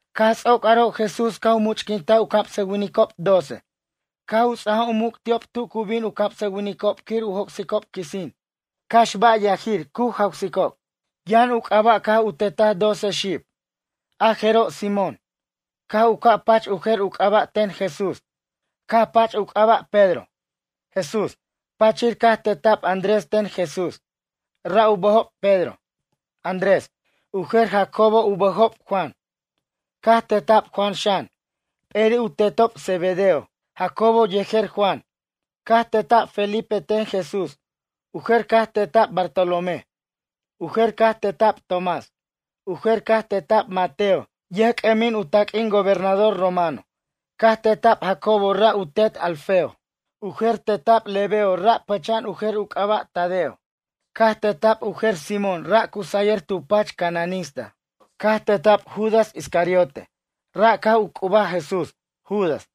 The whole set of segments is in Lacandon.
Caj ts'oc aro' Jesús caj u much'quintaj u camsʌwinicob doce. Caj u ts'aja u muc' ti'ob tu cu bin u camsʌwinicob quir u joc'sicob quisin. Cax ba' yajir, cu jawsicob. Yʌn u c'aba' caj u tetaj doce xib. A jeroj Simón, caj ca' pach u jer u c'aba' ten Jesús. Caj pach u c'aba' Pedro, Jesús. Pachir caj teta'b Andrés ten Jesús. Ra' u bʌjob Pedro, Andrés. U jer Jacobo u bʌjob Juan. Caj teta'b Juan xan. P'eri' u tetob Zebedeo Jacobo yejer Juan. Caj teta'b Felipe ten Jesús. U jer caj teta'b Bartolomé. U jer caj teta'b Tomás. U jer caj teta'b Mateo yʌjc'ʌmin u taq'uin gobernador romano. Caj teta'b Jacobo ra' u tet Alfeo. U jer teta'b Lebeo ra' pʌcha'an u jer u c'aba' Tadeo. Caj teta'b u jer Simón ra' cu sayʌr tu pach cananista. Caj teta'b Judas Iscariote, ra' caj u c'ubaj Jesús, Judas.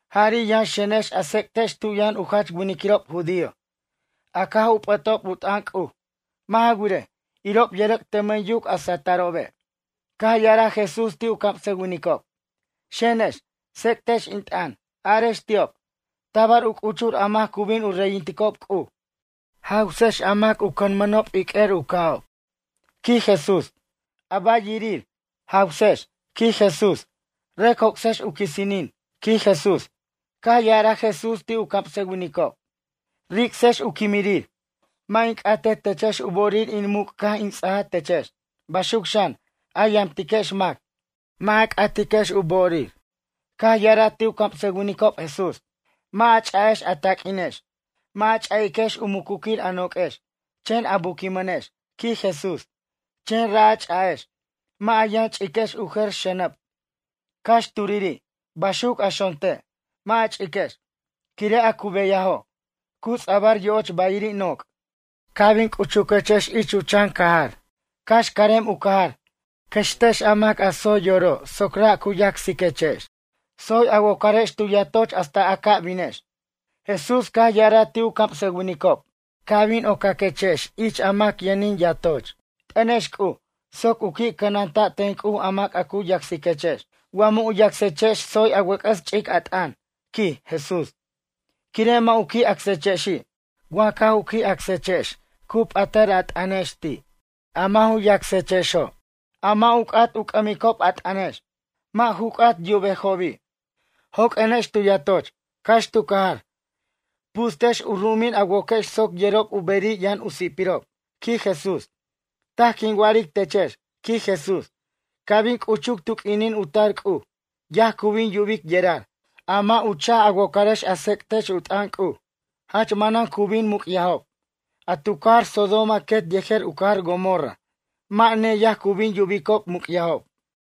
Jari' yʌn xenex a tsec'tex tu yʌn u jach winiquirob judío. A caj u p'ʌtob u t'ʌn C'uj. Mʌ' ja wirej, irob yʌrʌc' tʌmʌn yuc a satʌrobe'. Caj ya'araj Jesús ti' u camsʌwinicob: ―Xenex, tsec'tex in t'ʌn. Arex ti'ob: “Tabar u c'uchur a mac a cu bin u reyintejob C'uj.” Jawsex a mac u cʌnmʌnob iq'uer u ca'ob ―quij Jesús―. A ba' yajirir, jawsex ―quij Jesús―. Rʌc joc'sex u quisinin ―quij Jesús. Caj ya'araj Jesús ti' u camsʌwinicob: ―Ric'sex u quimirir. Mʌ' in c'atej techex u bo'orir in muc' caj in ts'aja techex. Baxuc xan, a yamtiquex mac, mʌ' a c'atiquex u bo'orir. Caj ya'araj ti' u camsʌwinicob, Jesús: ―Mʌ' a ch'a'ex a taq'uinex. Mʌ' a ch'a'iquex u mucuquir a noq'uex, chen a buquinmʌnex ―quij Jesús―. Chen ra' a ch'a'ex. Mʌ' a yʌn ch'iquex u jer xʌnʌb, cax turiri'. Baxuc a xonte', mʌ' a ch'iquex. Quire' a cu beyajo', cu ts'abʌr yo'och bayiri' noc'. Ca' bin c'uchuquex chan cajar, cax carem u cajar. Cʌxtex a mac a tsoy yoro' soc ra' cu yacsiquex. Tsoy a wocarex tu yatoch hasta a ca' binex. Jesús caj ya'araj ti' u camsʌwinicob: ―Ca' bin ocaquex ich mac yʌnin yatoch. T'ʌnex C'uj soc u qui' cʌnanta' ten C'uj a mac a cu yacsiquechex. Wa mʌ' u yacsechex tsoy a wʌc'ʌs ch'ic a t'ʌn ―quij Jesús―, quire' mʌ' u qui' acsechexi'. Wa caj u qui' acsechex cu p'atʌr a t'ʌnex ti'. A mʌ' ju yacsexo', a mʌ' u c'at u c'ʌmicob a t'ʌnex. Mʌ' ju c'at yubejobi'. Joq'uenex tu yatoch, cax tu cajar. Pustex u ru'umin a woquex soc yerob u beri' yʌn u si'pirob ―quij Jesús―. Taj quin wa'aric techex ―quij Jesús―. Ca' bin c'uchuc tu q'uinin u tar C'uj, yaj cu bin yubic yerar, a mʌ' u cha'j a wocarex a tsec'tex u t'ʌn C'uj. Jach manan cu bin muc'yajob. A tu cajar Sodoma quet yejer u cajar Gomorra mʌ' neyaj cu bin yubicob muc'yajob.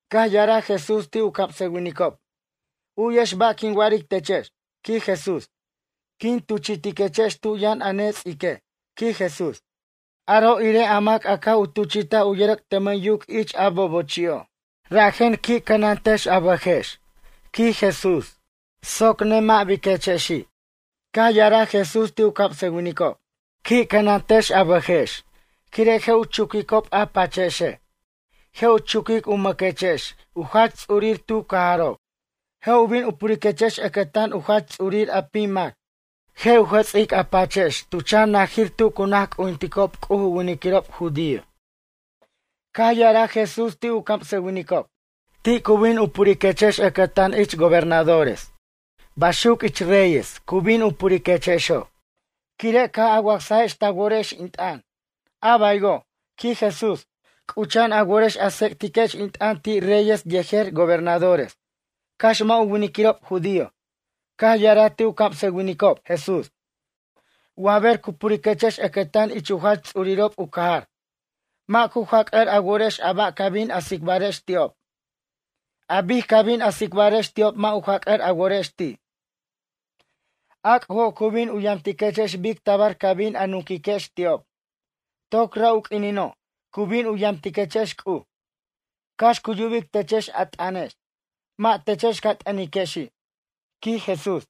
Caj ya'araj Jesús ti' u camsʌwinicob: ―U'yex ba' quin wa'aric techex ―quij Jesús―. Quin tuchi'quechex tu yʌn a nets'ique' ―quij Jesús―. Aro' irej a mac a caj u tuchi'taj u yʌrʌc' tʌmʌn yuc ich a bobochi'o'. Rajen qui' cʌnantex a bʌjex ―quij Jesús―, soc mʌ' nemʌ' biquechexi'. Caj ya'araj Jesús ti' u camsʌwinicob: ―Qui' cʌnantex a bʌjex, quire' je' u chuquicob a pachechex. Je' u chuquic u mʌchiquechex a jach ts'urir tu cajarob. Je' u bin u puriquechex ʌcʌtan u jach ts'urir a pim mac. Je' u jʌts'iquechex a pachex tu chan najir tu cu naj c'ujinticob C'uj u winiquirob judío. Caj ya'araj Jesús ti' u camsʌwinicob: ―Ti' cu bin u puriquechex ʌcʌtan ich gobernadores baxuc ich reyes cu bin u puriquechexo', quire' caj a wacsajex ta worex in t'ʌn. A baywo' ―quij Jesús―, c'ucha'an a worex a tsec'tiquex in t'ʌn ti' reyes yejer gobernadores. Cax mʌ' u winiquirob judío. Caj ya'araj ti' u camsʌwinicob, Jesús: ―Wa ber u puriquechex ʌcʌtan ich u jach ts'urirob u cajar. Mʌ' ju jac'ʌr a worex a ba' ca bin a tsicbarex ti'ob. An bic ca bin a tsicbarex ti'ob mʌ' u jac'ʌr a worex ti'. A C'ujo' cu bin u yamtiquechex bic tabar ca bin a nunquiquex ti'ob. Toc ra' u q'uinino', cu bin u yamtiquechex C'uj. Cax cu yubic techex a t'ʌnex. Mʌ' techex ca t'ʌnexi' ―quij Jesús―.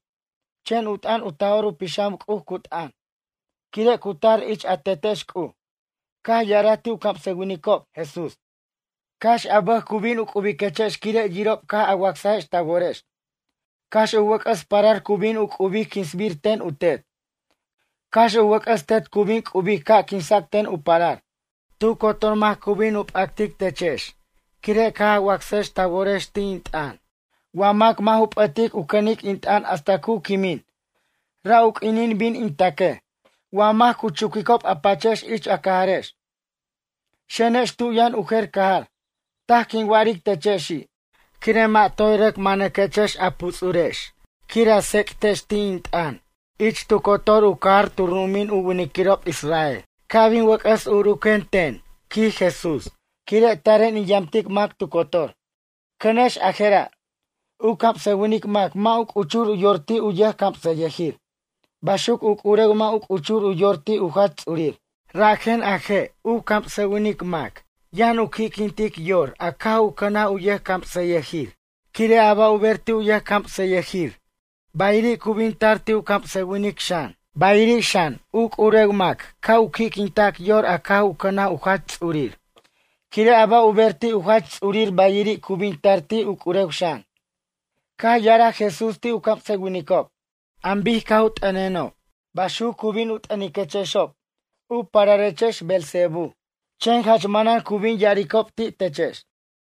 Chen u t'ʌn u Taj'or u Pixam C'uj cu t'ʌn, quire' cu tar ich a Tetex C'uj. Caj ya'araj ti' u camsʌwinicob, Jesús: ―Cax a bʌj cu bin u c'ubiquechex quire' yirob caj a wacsex ta worex. Cax u wʌc'ʌs parar cu bin u c'ubic quinsbir ten u tet. Cax u wʌc'ʌs tet cu bin c'ubic ca' quinsac ten u parar. Tu cotor mac cu bin u p'actic techex quire' caj a wacsajex ta worex ti' in t'ʌn. Wa mac mʌ' ju p'ʌtic u cʌnic in t'ʌn hasta cu quimin, ra' u quinin bin in taquej. Wa mac cu chuquicob a pachex ich a cajarex. Xenex tu yʌn u jer cajar. Taj quin wa'aric techexi'. Quire' mʌ' toy rʌc manʌquechex a puts'urex quir a tsec'tex ti' in t'ʌn ich tu cotor u cajar tu ru'umin u winiquirob Israel, ca' bin wʌc'ʌs uren ten ―quij Jesús―. Quire' taren in yamtic mac tu cotor. ’Cʌnex a jera'. U camsʌwinic mac mʌ' u c'uchur u yor ti' u yʌjcamsʌyʌjir. Baxuc u c'urew mʌ' u c'uchur u yor ti' u jach ts'urir. Rajen a je' u camsʌwinic mac yʌn u qui'quintic yor a caj u cʌnaj u camsʌyʌjir. Quire' a ba' u ber ti' u yʌjcamsʌyʌjir bayiri' cu bin tar ti' u camsʌwinic xan. Bayiri' xan, u c'urew mac ca' u qui'quintac yor a caj cʌnaj u jach ts'urir. Quire' a ba' u ber ti' u jach ts'urir bayiri' cu bin tar ti' u c'urew xan. Caj ya'araj Jesús ti' u camsʌwinicob: ―An bic caj u t'ʌnenob, baxuc cu bin u t'ʌniquechexob: “U pararechex Beelzebú.” Chen jach manan cu bin ya'aricob ti' techex.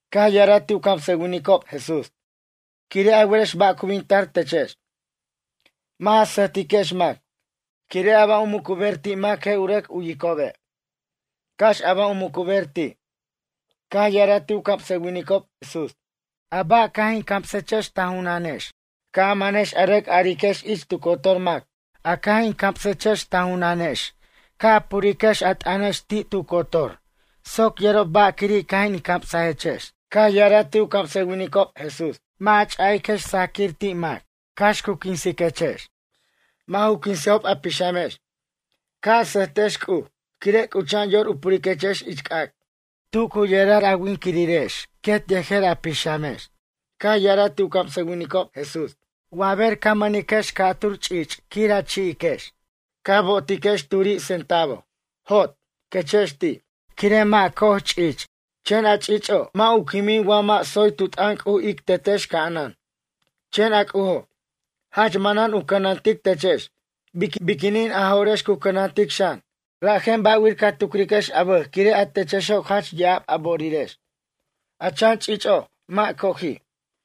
Caj ya'araj ti' u camsʌwinicob, Jesús: ―Quire' a werex ba' cu bin tar techex. Mʌ' a sʌjtiquex mac. Quire' a ba' u mucuber ti' mac je' u rʌc u'yicobe', cax a ba' u mucuber ti'. Caj ya'araj ti' u camsʌwinicob, Jesús: ―A ba' caj in camsechex ta junanex. Ca' a manex a rʌc ariquex ich tu cotor mac. A caj in camsex ta junanex ca' a puriquex a t'ʌnex tu cotor soc yerob ba' quiri' caj in camsajex. Caj ya'araj ti' u camsʌwinicob, Jesús: ―Mʌ' ja ch'a'iquex sajaquir ti' mac, cax cu quinsiquex. Mʌ' ju quinsejob a pixamex. Ca' a sʌjtex C'uj, quire' c'ucha'an yor u puriquechex ich c'ac'. Tu cu yerar a winquirex quet yejer a pixamex. Caj ya'araj ti' u camsʌwinicob, Jesús: ―Wa ber ca mʌnex ch'ich' ca'tur quir a chi'iquex. Ca bo'otiquex turi' centavo. “Jot” ―quechex ti'―, quire' mʌ' co'oj ch'ich'. Chen a ch'ich'o', mʌ' u quimin wa mʌ' tsoy tu t'ʌn C'uj ic Tetex ca'anan. Chen a C'ujo', jach manan u cʌnantic techex, biquinin a jo'rex cu cʌnantic xan. Rajen ba'wir ca tucriquex a bʌj quire' a techexo' jach ya'ab a bo'orirex, a chan ch'ich'o', mʌ' co'oji'.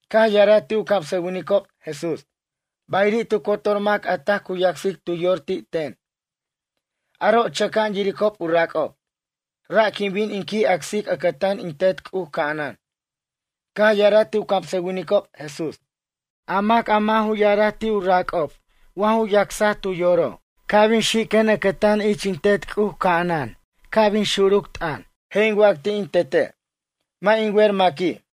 Caj ya'araj ti' u camsʌwinicob, Jesús: ―Bayiri' tu cotor mac a taj cu yacsic tu yor ti' ten, aro' chʌca'an yiricob u rac'ob. Ra' quin bin in qui' acsic ʌcʌtan in Tet C'uj ca'anan. Caj ya'araj ti' u camsʌwinicob, Jesús: ―A mac a mʌ' ju ya'araj ti' u rac'ob wa ju yacsaj tu yoro'. Ca' bin xiquiquen ʌcʌtan ich in Tet C'uj ca'anan ca' bin xuruc t'ʌn. Je' in wac ti' in Tete': “Mʌ' in wer maqui'.”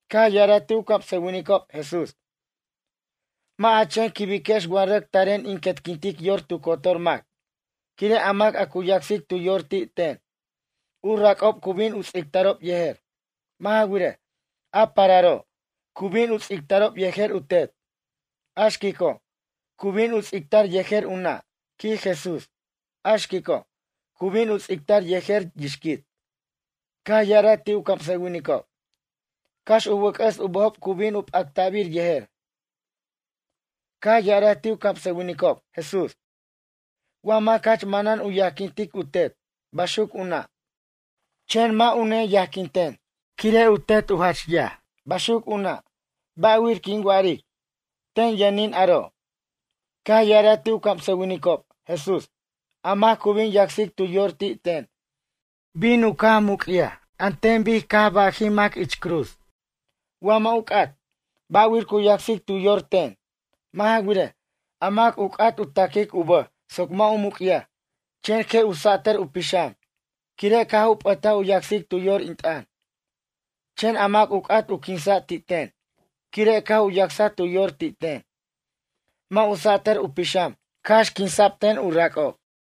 Caj ya'araj ti' u camsʌwinicob, Jesús: ―Mʌ' a chen quibiquex wa rʌc taren in quetquintic yor tu cotor mac. Quire' a mac a cu yacsic tu yor ti' ten, u rac'ob cu bin u ts'ictarob yejer. Mʌ' ja wirej, a pararo', cu bin u ts'ictarob yejer u tet. A xquico', cu bin u ts'ictar yejer u nʌ' ―quij Jesús―. A xquico', cu bin u ts'ictar yejer yixquit. Caj ya'araj ti' u camsʌwinicob: ―Cax u wʌc'ʌs u bʌjob cu bin u p'acta'bir yejer. Caj ya'araj ti' u camsʌwinicob, Jesús: ―Wa mac jach manan u yajquintic u tet, baxuc u nʌ', chen mʌ' u neyajquinten, quire' u tet jach yaj, baxuc u nʌ'. Ba'wir quin wa'aric: “Ten yʌnin aro'.” Caj ya'araj ti' u camsʌwinicob, Jesús: ―A mac cu bin yacsic tu yor ti' ten, bin u ca' muc'yaj an ten bic caj u bajij mac ich cruz. Wa mʌ' u c'at, ba'wir cu yacsic tu yor ten? Mʌ' ja wirej, a mac u c'at u taquic u bʌj soc mʌ' u muc'yaj, chen je' u sa'tʌr u pixam, quire' caj u p'ʌtaj u yacsic tu yor in t'ʌn. Chen a mac u c'at u quinsa' ti' ten, quire' caj u yacsaj tu yor ti' ten. Mʌ' u sa'tʌr u pixam, cax quinsa'b ten u rac'ob.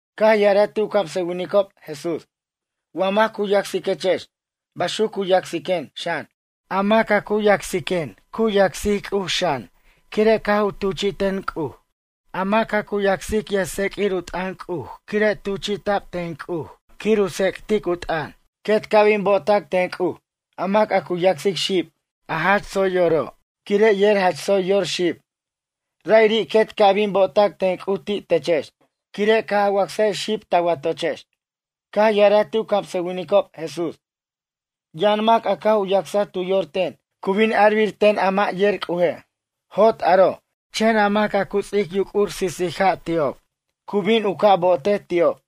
Caj ya'araj ti' u camsʌwinicob, Jesús: ―Wa mac cu yacsiquechex, baxuc cu yacsiquen, xan. A mac cu yacsiquen cu yacsic C'uj xan quire' caj u tuchi'ten C'uj. A mac a cu yacsic yʌjtseq'uir u t'ʌn C'uj quire' tuchi'ta'b ten C'uj quir u tsec'tic u t'ʌn. Quet ca' bin bo'ota'c ten C'uj. A mac a cu yacsic xib, a jach tsoy yoro', quire' yer jach tsoy yor xib. Ra'iri' quet ca' bin bo'otac ten C'uj ti' techex, quire' caj a wacsajex xib ta watochex. Caj ya'araj ti' u camsʌwinicob, Jesús: ―Yʌn mac a caj u yacsaj tu yor ten, cu bin arbir ten a mʌ' yer C'uje': “Jot aro.” Chen a mac a cu ts'ic yuc'ur sisis ja' ti'ob, C'uj bin u ca' bo'otej ti'ob.